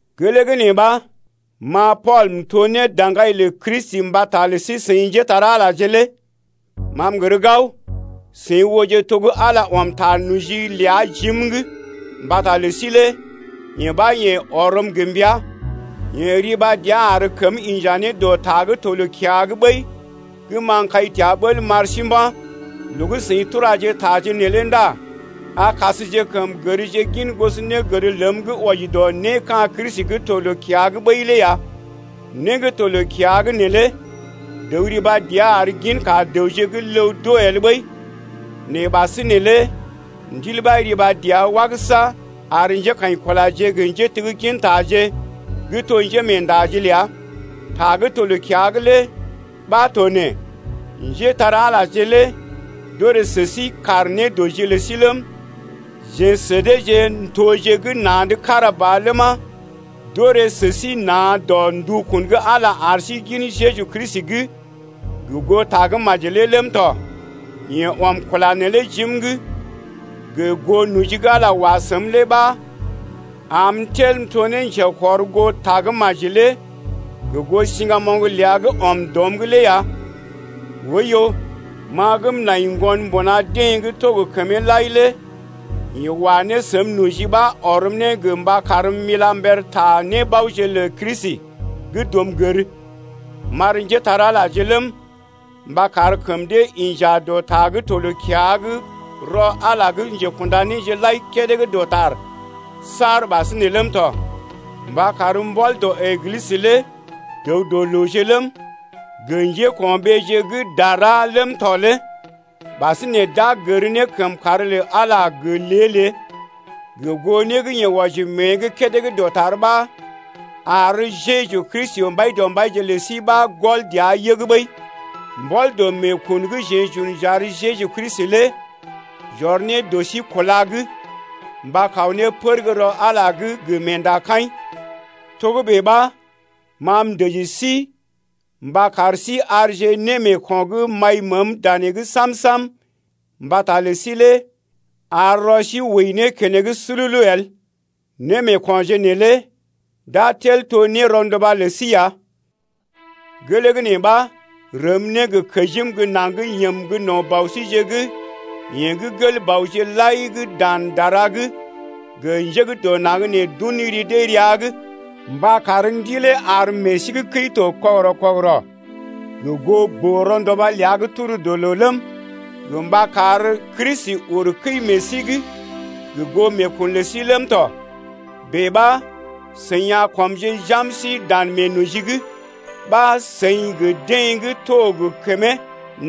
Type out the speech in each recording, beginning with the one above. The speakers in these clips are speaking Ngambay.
Gelee gə́ nee ɓa, ma Pool m’to ne daŋgai lə Kristi mbata lə sí-seḭ njépole-magəje lé... Ma m’gər gao, seḭ ooje to gə́ Ala ɔm ta noji ləa jim’g mbata lə sí lé. Yee ɓa yeḛ ɔrm ne gə mbəa. Yeḛ riba dəa ar kəm inja ne dɔ ta gə́ to loo-kiya’g ɓəi gə́ ma m’kai təa bəl m’ar sí mba̰. Loo gə́ seḭ turaje taje neelé ndá a kasjekəm gərje gin gosonégər ləm gə́ wɔji dɔ né ka̰ Kristi gə́ to loo-kiya’g ɓəi lé ya. Né gə́ to loo-kiya’g neelé dəw riba dəa ar ginka dəwje gə́ ləw d’oo el ɓəi. Nɛ ɓasinè lé Ndil ɓa riba dəa wagəsa ar njékaḭkulaje gə njéteggintaje gə́ to njémeendaje ləa. Ta gə́ to loo-kiya’g lé ɓa to nee: Njétar-Alaje lé d’orè sə sí kaar nédɔji lə sí ləm, jeḛ sə deeje n’toje gə́ na̰’d kára ba ləma, d’orè sə sí na̰ dɔ ndukun gə́ Ala ar sí gin Jeju Kristi’g gə goo Tagə́maji lé ləm tɔ. Yeḛ ɔm kula neelé jim’g gə goo noji gə́ Ala wa səm lé ɓa am m’tel m’to ne njekɔrgoo Tagə́maji lé gə goo siŋgamoŋ ləa gə́ ɔm dɔm’g lé ya. Oiyo, ma gə́ m’nai ŋgon mbuna deḛ gə́ to gə kəmee lai lé yeḛ wa ne səm noji ɓa ɔrm ne gə mba karm m’ila mber ta nébaoje lə Kristi gə́ dum gər, m’ar njépole-magəje ləm, mba kar kəm dee inja dɔ ta gə́ to loo-kiya’g rɔ Ala gə́ njekunda néje lai kédé gə́ dɔtar saar ɓasinè ləm tɔ. Mba kar mbɔl dɔ Eglisə lé dəw-dɔ-looje ləm, gə njéko̰ɓeeje gə́ dara gə́ tar ləm tɔ lé ɓasinè d’a gər ne kəmkàr lə Ala lé gə lée-lée gə goo né gə́ yeḛ wɔji mée’g kédé gə́ dɔtar ɓa ar Jeju Kristi Mbaidɔmbaije lə sí ɓa gɔl dəa yəg ɓəi. Mbɔl dɔ meekun gə́ jeḛ j’un j’ar Jeju Kristi lé j’ɔr ne dɔ sí kúla’g mba kaw ne pər gə́ rɔ Ala’g lé gə meendakaḭ. Togə́bè ɓa, ma m’dəji sí mba kar sí arje némeeko̰ gə́ m’ai məəm danee’g sam-sam mbata lə sí lé ar rɔ sí wəi ne keneŋ sululu el, némeekonje neelé d’a tel to nérɔnduba lə sí ya. Gelee gə́ nee ɓa, m’rəm ne gə kəjim gə́ naŋg yəm gə́ no̰ Bɔ síje’g yeḛ gə́ gel-bɔje lai gə́ dan dara’g gə njé gə́ dɔ naŋg nee d’un ri dee rəa’g mba kar Ndilee ar meḛ sí gə́ kəi to kɔgərɔ-kɔgərɔ gə goo boo-ronduba ləa gə́ tur dɔ loo ləm, gə mba kar Kristi uru kəi meḛ sí’g gə goo meekun lə sí ləm tɔ. Bèe ɓa seḭ a kɔmje jam sí dan meenoji’g ɓa seḭ gə deḛ gə́ to gə kəmee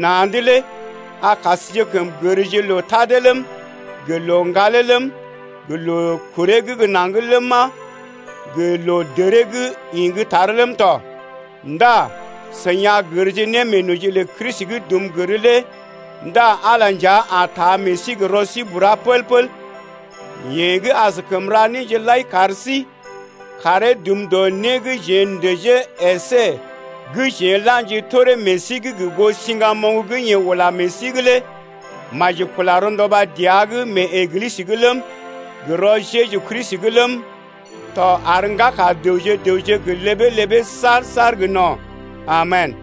na̰’d lé a kasjekəm gərje loo tadee ləm, gə loo ŋgalee ləm, gə loo kuree gə́ naŋg ləma, gə loo dəree gə́ ḭ gə́ tar ləm tɔ. Ndá seḭ a gərje ne meenoji lə Kristi gə́ dum gər lé ndá Ala nja a taa meḛ sí gə rɔ sí bura pəl-pəl tɔ. Yeḛ gə́ askəm ra néje lai kar sí, karee dum dɔ né gə́ jeḛ n’dəjee əsé gə́ jeḛ n’la̰ji toree meḛ sí’g gə goo siŋgamoŋ gə́ yeḛ ula meḛ sí’g lé maji kula rɔnduba dəa’g mee Eglisə’g ləm, gə rɔ Jeju Kristi’g ləm tɔ ar ŋgaka dəwje-dəwje gə ləbee-ləbee saar-saar gə no̰. Amen.